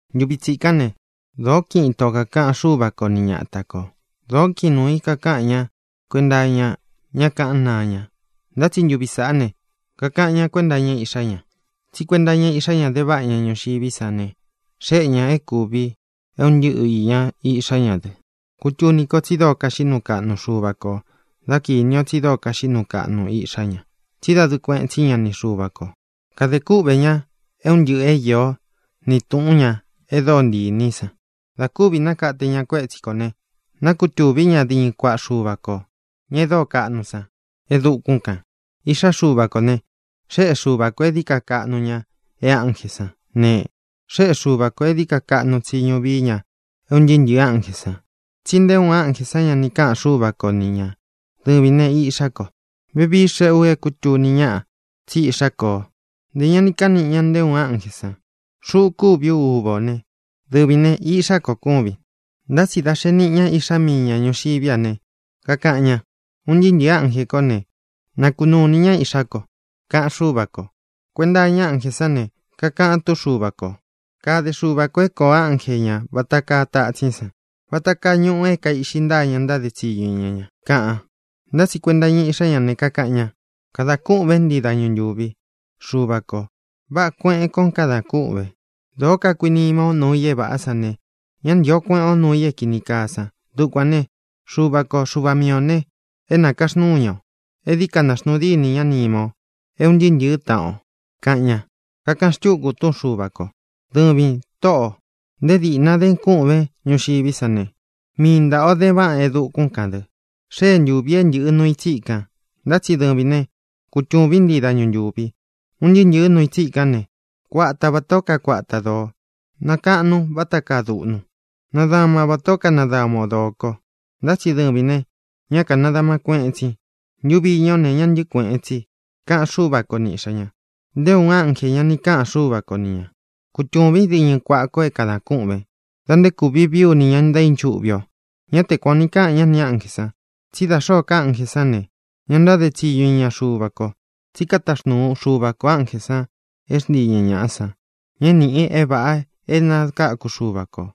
Ntuvi tsikán ne, dōó kiꞌin ito kākaꞌan Xúva ko ni ñata kō. Dōó kiꞌin nuū í kakaꞌan ñá kuenta iña ñá kaꞌan náa ña. Ntá tsi ntuvi sāꞌá ne, kakaꞌan ñá kuenta iña Iꞌxá ña. Tsí kuenta iña Iꞌxá ña de váꞌa ña ñuxiví san ne, xéꞌe ñā é kūvi é un ntɨꞌɨ īña Iꞌxá ña dɨ. Kūtuni ko tsi dóo kaxiꞌí nuu kaꞌnu Xuva kō dá kīni o tsi dóo kaxiꞌí nuu kaꞌnu Iꞌxá ña, tsí dadɨɨ kueꞌen tsí ña ni Xuva kō. Kade kúꞌvē ña é un ntɨꞌɨ̄ é īó ni tūꞌún ña e dóo ntii īní i san. Dā kúvi nakate ña kuétsi kō ne, nákutuví ña diñɨ kuaꞌa Xuva kō, ña e dóo kaꞌnu san, e dukún kān. Iꞌxá Xuva kō ne, xéꞌe Xuva kō é dií ka kaꞌnu ña e ánjē sán ne, xéꞌe Xuva kō é dií ka kaꞌnu tsiñu vií ña é un ntɨɨ́ ntɨ̄ɨ́ ánjē san. Tsi nté uun ánjē san ña ni káꞌān Xúva ko ni ñā: Dɨvīn ne, Iꞌxá ko; vevii xéꞌe u é kūtuni ñaꞌa tsí Iꞌxá ko o; ntē ña ní kaꞌan niꞌi ña nté uun ánjē san: Xuꞌu kúvi ú uva ō né, dɨvīn ne, iꞌxá ko kúvin. Ntá tsi dá xee niꞌi ña Iꞌxá mii ña ñūxiví a ne, kakaꞌan ña: Un ntɨɨ́ ntɨ̄ɨ́ ánjē kó ne, na kunuu inī ñá Ihxá ko, kaꞌan Xúva kō. Kuenta iña ánjē sán ne, kakaꞌan túꞌun Xuva kō: Kade Xuva kō é kōo ánje ñā vata kaa tatsín san, vata kaa ñuꞌu é kaīꞌxi ntáa ña ntáde tsiñu iña ña, kaꞌan. Ntá tsi kuenta iña Iꞌxá ña ne, kakaꞌan ña: Kadan kûꞌvén ntii dañu ntuvi, Xuvā ko. Váꞌā kueꞌen koo kadan kúꞌvēn. Dōo kakuinima o nuu i é vāꞌá san ne, ña ntío kueꞌen o nuu i é kīni kaa san. Dukuān né, Xuva ko, Xuva mii ō ne, é nakaxnúu ña o e dií ka naxnuu dínī ñá nima o é ūn ntɨɨ́ ntɨ̄ɨ́ taꞌan o, kaꞌan ña. Kakaꞌan xtúku túꞌun Xuva kō: Dɨvīn, Tóꞌō, nté dīꞌna den kûꞌvén ñuxiví san ne, mii ntāꞌa o den váꞌan e dukún kān dɨ. Xée ntūvi é ntɨ̄ꞌɨ nuu i tsíkān, ntá tsi dɨvīn né, kutūvín ntii dañu ntūvi. Un ntɨɨ́ ntɨ̄ɨ́ nuu i tsikán ne, kuata vatā ó kakuata dōo. Nakaꞌnun váta kaa duꞌnu. Nadaman vatā ó kanadama o dōo ko. Ntá tsi dɨvīn ne, ñá kānadaman kueꞌen tsin. Ntuvi iña ó ne, ña ntɨ́ꞌɨ kuēꞌen tsi, kaꞌan Xúva ko ni Iꞌxā ña. Nté uun ánjē ña ni káꞌan Xuva ko ni ñā: Kutūvín diñɨ kuaꞌa ko é kadā kûꞌven da nté kūvi vií u nī ña ntaínchuꞌvi o. Ñá te kuan ō ni káꞌan ña nī ánjē san. Tsí da xōó ka ánjē sán ne, ña ntáde tsiñu iña Xuva ko. Tsí kataxnuu Xuva kō ánjē san é xntii ña ñāꞌa san, ña é nīꞌi i é vāꞌa é nakáku Xuva kō.